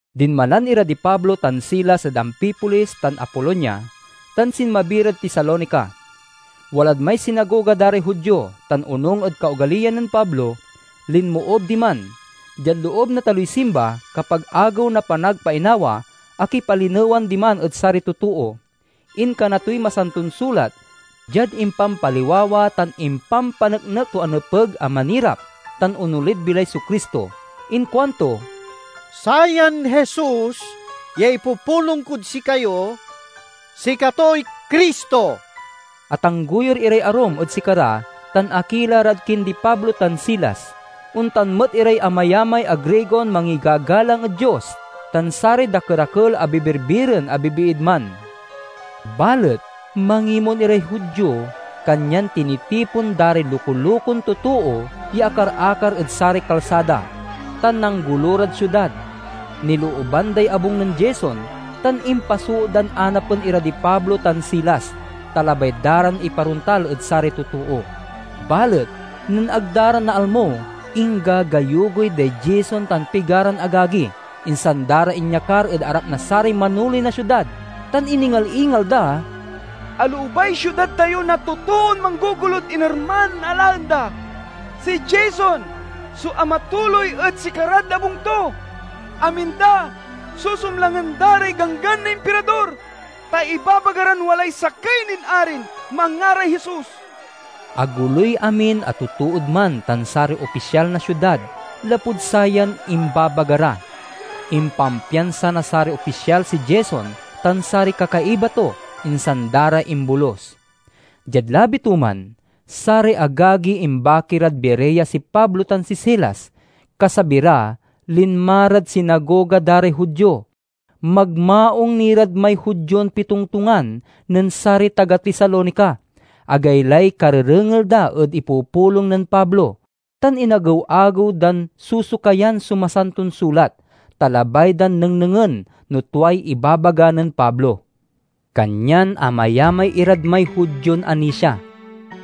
Dinmalan ira di Pablo tan Silas ed Amfipolis tan Apolonia, tan sinmabi rad Tesalonica. Walad may sinagoga da ray Judio, tan onung ed kaogaliyan nen Pablo, linmoob diman. Diad loob na taloy simba, kapag Agew na Panagpainawa, akipalinewan diman ed saray totoo. Inkana toy Masanton Sulat diad impampaliwawa tan impampaneknek to a nepeg a manirap tan onolid bilay so Cristo. Inkuan to, "Sayan Jesus ya ipupulong kod sikayo, sikatoy Cristo!" Atanggoyur iray arum ed sikara tan akila rad kindi Pablo tan Silas; ontan met iray amayamay a Grigon mangigagalang ed Dios, tan saray dakerakel a bibirbiren a bibiid man. Balet mangimon iray Judio, kanyan tinitipon da ray luko-lukon totoo ya akar-akar ed saray kalsada, tan nanggolo rad siudad. Nilooban day abung nen Jason, tan impasoot dan anapen ira di Pablo tan Silas, ta labay da ran iparontal ed saray totoo. Balet nen ag da ra naalmo, inggagayugoy day Jason tan pigaran agagi, insan da ra inyakar ed arap na saray manoley na siudad, tan iningal-ingal da, "Aloobay siudad tayo na totoon manggogolod inerman a laen da! Si Jason so amatuloy ed sikarad abung to. Amin da susumlangen da ray ganggan na Impirador, ta ibabaga ran walay sakey nin arin manngaray Jesus." Agoloy amin a totood man tan saray opisyal na siudad lapud sayan imbabaga ra. Impampiansa na saray opisyal si Jason tan saray kakaiba to, insan da ra imbolus. Diad labi to man, saray agagi imbaki rad Berea si Pablo tan si Silas. Kasabi ra, linma rad sinagoga da ray Judio. Magmaung ni rad may Judion pitongtongan nen saray taga Tesalonica. Agaylay karerengel da ed ipupulong nen Pablo, tan inagew-agew dan sosokayan so Masanton Sulat, ta labay dan nengnengen no tuay ibabaga nen Pablo. Kanyan amayamay irad may Judion anisia;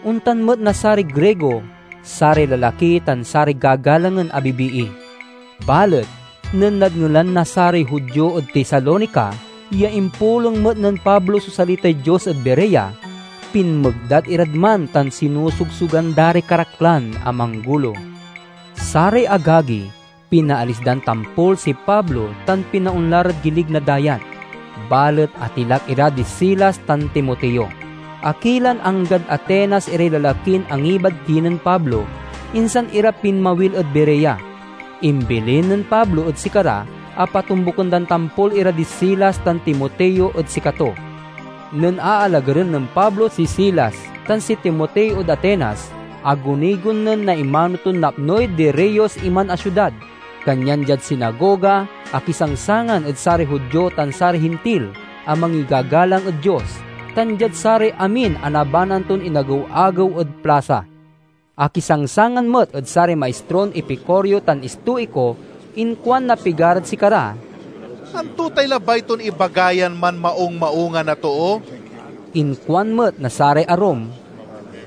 ontan met na saray Grigo—saray lalaki tan saray gagalangen a bibii. Balet nen nadngelan na saray Judio ed Tesalonica ya impulong met nen Pablo so salitay Dios ed Berea, pinmegdat irad man tan sinosogsogan da ray karaklan a manggolo. Saray agagi pinaalis dan tampol si Pablo tan pinaonla rad gilig na dayat, balet atilak ira di Silas tan Timoteo. Akilan anggad Atenas iray lalakin angibad kinen Pablo, insan ira pinmawil ed Berea. Imbilin nen Pablo ed sikara a patombuken dan tampol ira di Silas tan Timoteo ed sikato. Nen aalagaren nen Pablo si Silas tan si Timoteo ed Atenas, agunigon nen naimano ton napnoy diriyos iman a siudad. Kanyan, diad sinagoga akisangsangan ed saray Judio tan saray Hintil a mangigagalang ed Dios, tan diad saray amin a nabanaan ton inagew-agew ed plasa. Akisangsangan met ed saray maistron Epicureo tan Estoico. Inkuan na pigarad sikara, "Anto tay labay ton ibaga yan manmaung-maungan a too?" Inkuan met na saray arum,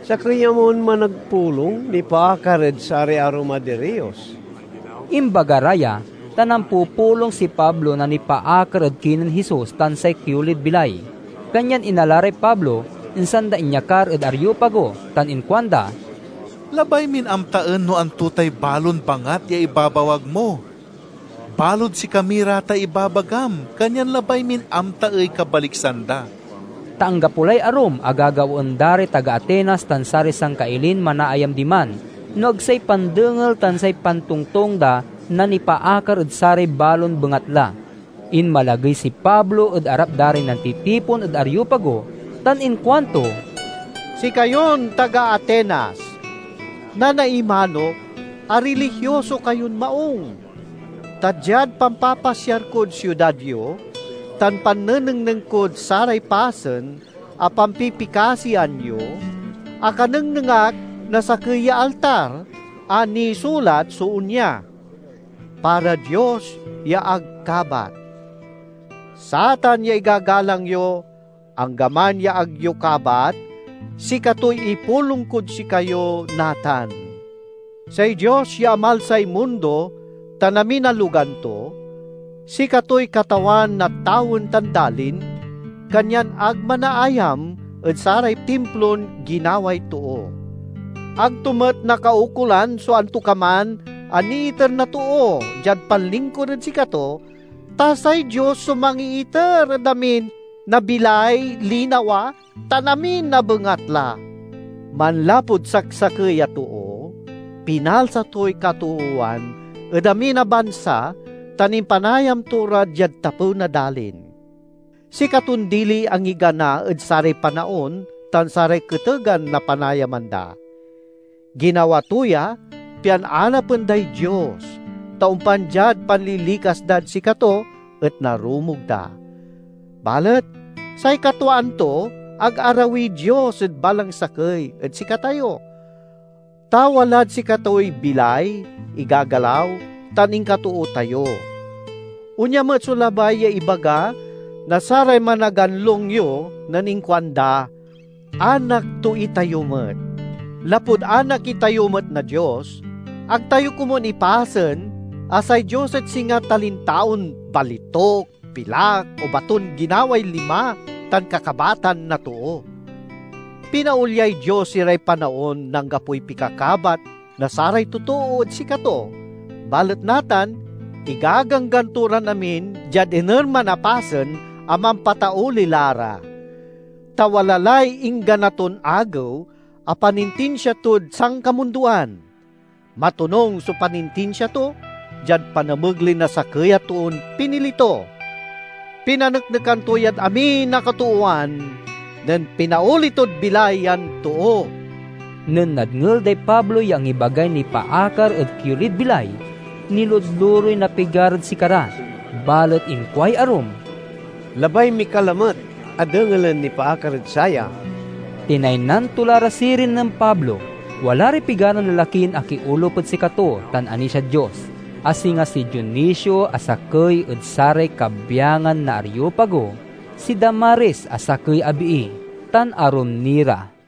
"Sakey amon managpulong nipaakar ed saray arum a diriyos." Imbaga ra ya, ta nampupulong si Pablo na nipaakar ed kinen Jesus tan say kiolid bilay. Kanyan inala ray Pablo, insan da inyakar ed Areopago, tan inkuanda, "Labay min amtaen no anto tay balon bangat ya ibabawag mo. Balod sikami ra tay ibabagam, kanyan labay min amtaey kabaliksan da." (Ta anggapo lay arum a gagawaen da ray taga Atenas tan saray sangkailin manaayam diman no ag say pandengel tan say pantongtong da na nipaakar ed saray balon bengatla.) Inmalagey si Pablo ed arap da ray nantitipon ed Areopago tan inkuanto, "Sikayon taga Atenas, nanaimanok a rilihioso kayon maung, ta diad pampapasiar kod siudad yo tan pannenengneng kod saray pasen a pampipikasian yo, akanengneng ak na sakey ya altar a nisulat so onya: 'Para Dios ya ag Kabat.' Satan ya igagalang yo, anggaman ya ag yo kabat, sikatoy ipulong kod sikayo natan. Say Dios ya amalsay mundo tan amin a logan to, sikatoy Katawan na tawen tan dalin, kanyan ag manaayam ed saray Timplon ginaway too. Ag to met nakaukolan so antokaman a niiter na too diad panlingkur ed sikato, ta say Dios so mangiiter ed amin na bilay, linawa, tan amin a bengatla. Manlapud saksakey a too, pinalsa toy katoowan ed amin a bansa tan impanayam to ra diad tapew na dalin. Sikaton diliy angigana ed saray panaon tan saray ketegan na panayaman da. Ginawa to ya pian anapen day Dios, ta ompan diad panlilikas dad sikato et narumog da. Balet say katwaan to, ag arawiy Dios ed balang sakey ed sikatayo, ta 'Walad sikatoy bilay, igagalaw, tan inkatoo tayo.' Onya met so labay ya ibaga na saray managanlong yo nen inkuanda, 'Anak to itayo met!' Lapud anak itayo met na Dios, ag tayo komun ipasen a say Dios et singa talintaon balituk, pilak, o baton ginaway lima tan kakabatan na too. Pinaolyay Dios iray panaon na anggapoy pikakabat na saray totoo ed sikato, balet natan igaganggan to ran amin diad inerman a pasen a mampatauli la ra. Ta wala lay inggana ton agew a panintinsia tod sankamundoan. Matonung so panintinsia to, diad panamegley na sakey a toon pinili to. Pinaneknekan to yad amin a katoowan nen pinaoli tod bilay yan too." Nen nadngel day Pablo ya angibagay nipaakar ed kiolid bilay, niludlurey na pigarad sikara. Balet inkuay arum, "Labay mi ka lamet a dengelen nipaakar ed saya." Tinaynan to la ra sirin nen Pablo. Wala ray pigaran lalakin akiolup ed sikato tan anisiad Dios, a singa si Dionisio a sakey ed saray kabyangan na Areopago, si Damaris a sakey a bii, tan arum ni ra.